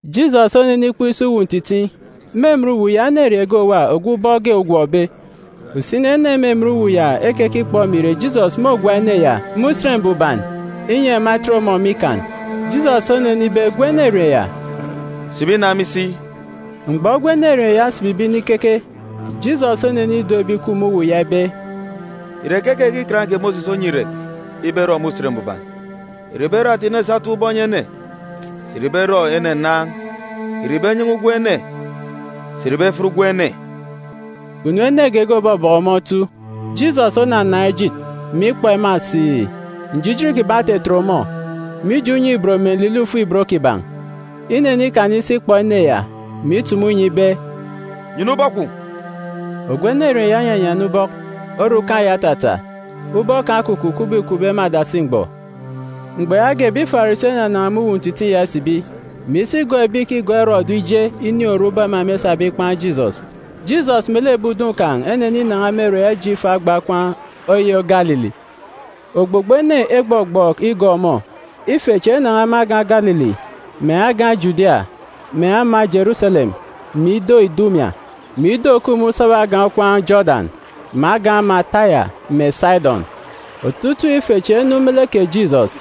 Jisọs onenikpọk isi uwu ntitiin̄. Me emen uwu ya enerieen̄ ge òwa ogwu ubọk ge ogọmbe. Usini ene me emen uwu ya ekekikpọ mè ìre Jisọs môgwa ene ya me Usen Mbuban, inyi ema etet ọmọ me ikan. Jisọs onenibe gwun̄ enerieen̄ ya, “Sibi na me isi.” Mgbọ gwun̄ enerieen̄ ya osibibe inikeke, Jisọs onenido ebi ìkup me uwu ya ibe, “Ìre keke ke Ikan kè Mosis onyi irek ibe erọ me Usen Mbuban? Ìre ìbe erọ ata inu esa etap ubọk enyi ene, sà ìre ibe erọ ene nnaan̄? Ìre ibe enyan̄a ugwem ene, sà ìre ibe efiat ugwem ene?” Kpunu ene geege òbọbọkọ ọmọ otu. Jisọs onanaan̄ ejit, mè ikpọ ema siì. Njijin kiban̄ otetet ọmọ, mije unye-ibot mè nlilọ ifuk-ibot kiban̄. Inenikana isi ikpọ ene ya, mè itumu inyi ibe, “Nyana ubọk kwun̄!” Ogwu enerieen̄ ya onyanyana ubọk, orukan̄ ya otata, ubọk kan̄ okukup kubọk îkupbe me adasi mgbọ. Mgbọ yaage ebi Farisi enanan̄a me uwu ntitiin̄ ya isibi, mè isi igọọk ebi ìkigọọk Erọdu ije inin̄ oru ubọk ema mêsabe ikpan̄ Jisọs. Jisọs melek ebi udun̄ kan̄ eneninan̄a me ere ya ije ifo agba okwaan̄ oyô Galili. Ogbogbo ene egbọgbọọk igọọk ọmọ. Ife chi enan̄a me agan̄ Galili, mè agan̄ Judia, mè ama Jeruselem, mè ido Idumia, mè ido òkup me usaba agan̄ okwaan̄ Jodan, mè agan̄ ama Taya mè Sidọn. Otutuuk ife chi enu me lek kè Jisọs,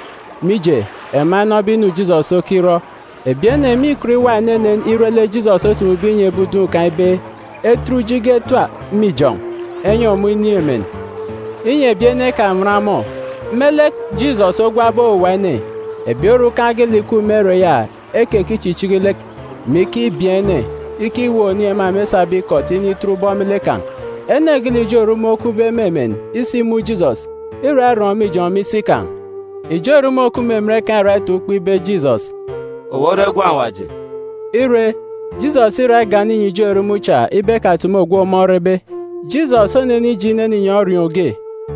mije, ema enọbe inu Jisọs okirọ. Ebi ene mîkọt iwa enenen ire lek Jisọs otumube inyi ebi udun̄ kan̄ ibe etet uji ge etap me ijọn̄ enyi ọmọ inin̄ emen, inyi ebi ene ekanwan ọmọ. Me lek Jisọs ogwabe owuwa ene, ebi orukan̄ geelek ìkup me ere ya ekekichichiki lek, mè ikibieen̄ ene, ikiweek oniin̄ ema mêsabe ikọt initet ubọk me lek kan̄. Ene geelek ijo erumun̄ okupbe me emen isimun̄ Jisọs, îra irọn̄ me ijọn̄ me isi kan̄, ijo erumun̄ òkup me emen kan̄ îra itaan̄ ukpo ibe Jisọs, “Owu ore Gwun̄ Awaji.” Ire, Jisọs îra igana inyi ijo erumun̄ cha ibe ekatumu ogwu ọmọ orebe. Jisọs onenije inene inyọn̄ orioon̄ ge,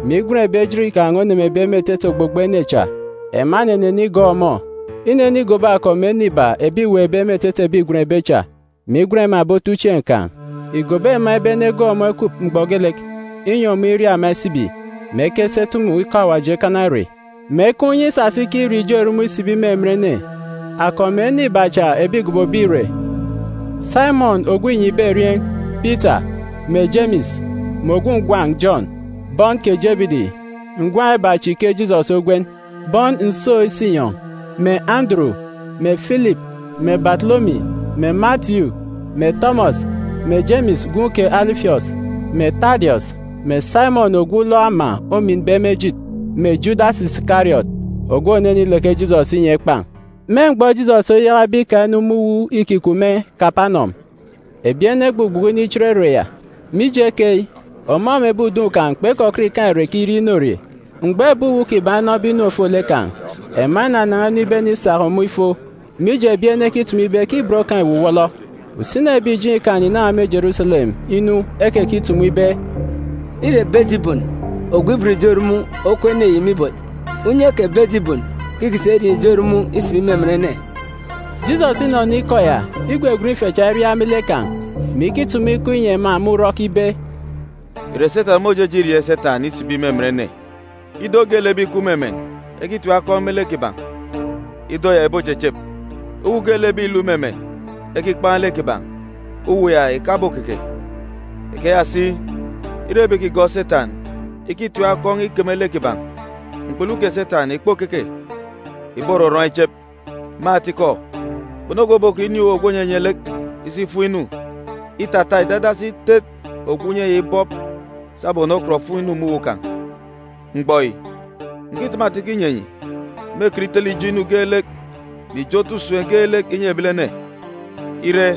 mè igwen ebi ejit kan̄ onemebe me etete ogbogbo ene cha. Ema enenene igọọk ọmọ. Inenigobo akọp mè ene iba ebi îweekbe me etete ebi îgwenbe cha, mè igwen ema ebi otuchieen̄ kan̄. Ìgobo ema ibe enegọọk ọmọ ekup mgbọ geelek, inyi ọmọ iria ema isibi, mè ekesi etumu ikọ Awaji ekana ere, mè ekaan̄ unye isasa ikirieen̄ ijo erumun̄ isibi me emen ene. Akọp mè ene iba cha ebi îgobobe ìre: Saimọn ogwu înyibe erieen̄, Pita, mè Jemis, mè ogwu ngwan̄ Jọn, bọn kè Jebidi (ngwan̄ iba chi ke Jisọs ogwen Bowaneges, eyi òsisibi “Bọn nsook-isinyọn̄”), mè Anduru, mè Filip, mè Batolomi, mè Matiyu, mè Tọmọs, mè Jemis gwun̄ kè Alifiọs, mè Tadiọs, mè Saimọn ogwu ulọk ama ominbe me ejit, mè Judas Isikariọt ogwu ònenileke Jisọs inyi ekpan̄. Me mgbọ Jisọs oyakabe ika inu me uwu îkikup me Kapanọm, ebi ene egbugbuku inichit ere ya. Mije keyi, ọmọ mè ebi udun̄ kan̄ kpekọkọt ikaan̄ irek irie inorie. Mgbọ ebi uwu kiban̄ enọbe inu ofolek kan̄, ema enanan̄a inu ibenisak ọmọ ifo, mije, ebi ene ekitumu ibe ke ibot kan̄ îwuwọlọ. Usini ebi ìjeen̄ Ikan ìnan̄a me Jeruselem inu ekekitumu ibe, “Îre Bejibun ogwu ibot ijo erumun̄ okup ene yi me ibot. Unye kè Bejibun ke îkisa irieen̄ ijo erumun̄ isibi me emen ene.” Jisọs inọnọ ikọ ya, igwegwen ife cha iriaak me lek kan̄, mè ikitumu ikọ inyi ema me urọk ibe, “Ìre Setan môjeje irieen̄ Setan isibi me emen ene? Ido geelek ebi ìkup me emen ekitim akọn̄ me lek kiban̄, ido ya ìbochechep. Uwu geelek ebi ìluk me emen ekikpan̄ lek kiban̄, uwu ya ìkabokeke. Ikeya si, ire ebi ìkigọọk Setan ikitim akọn̄ ikeme lek kiban̄, mkpulu kè Setan ìkpokeke, ìborọrọn̄ ichep. Me atikọ, kpunu ogwu òbokọt inin̄ uwu ogwu ònyenye lek isi ifum inu, îtata ìdadasi itet ogwu unye ya ibọp sabum ònokọt òfum inu me uwu kan̄. Mgbọ yi, ǹkitumu atikọ inyi enyi, mêkọt itele ijo inu geelek mè ijo otu usem geelek inyi ebilene. Ire,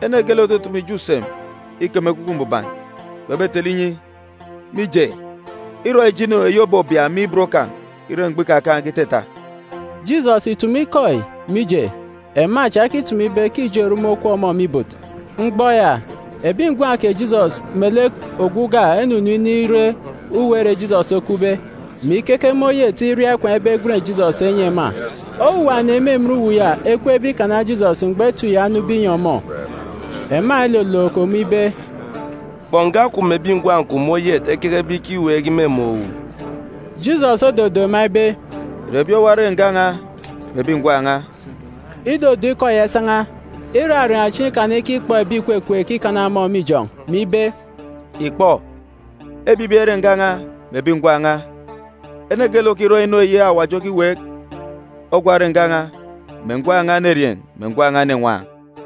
ene geelek òtutumu ijo usem ikeme Ekwukwu Mbuban, kpebetele inyi, mije, îrọ ijo inu eyi òbobia me ibot kan̄ ire mgbọ ikakaan̄ge itata.” Jisọs ìtumu ikọ yi, mije, ema cha ekitumu ibe ke ijo erumun̄ okup ọmọ me ibot. Mgbọ ya, ebi ngwan̄ kè Jisọs melek ogwu uga enunu inire uwu ere Jisọs okupbe, mè ikeke me oyet iria ikwaan̄ ibe egwen Jisọs enyi ema. Owuwa ene me emen uwu ya ekweekbe ikana Jisọs mgbọ etip ya onube inyi ọmọ. Ema elolook ọmọ ibe, “Kpọ, nga kwun̄ mè ebi ngwan̄ kwun̄a me oyet ekekebe ikiweek imumun̄ owu.” Jisọs ododo ema ibe, “Ìre ebi owa ere nga n̄a mè ebi ngwan̄ n̄a?” Idodo ikọ ya isan̄a, iraraan̄ chieen̄ ikana ikikpọ ebi ìkwekweek ikana ọmọ me ijọn̄, mè ibe, “Ìkpọ, ebibi ere nga n̄a mè ebi ngwan̄ n̄a. Ene geelek òkirọ inu Awaji okiweek, ogwa ore nga n̄a mè ngwan̄ n̄a enerieen̄ mè ngwan̄ n̄a enenwaan̄.”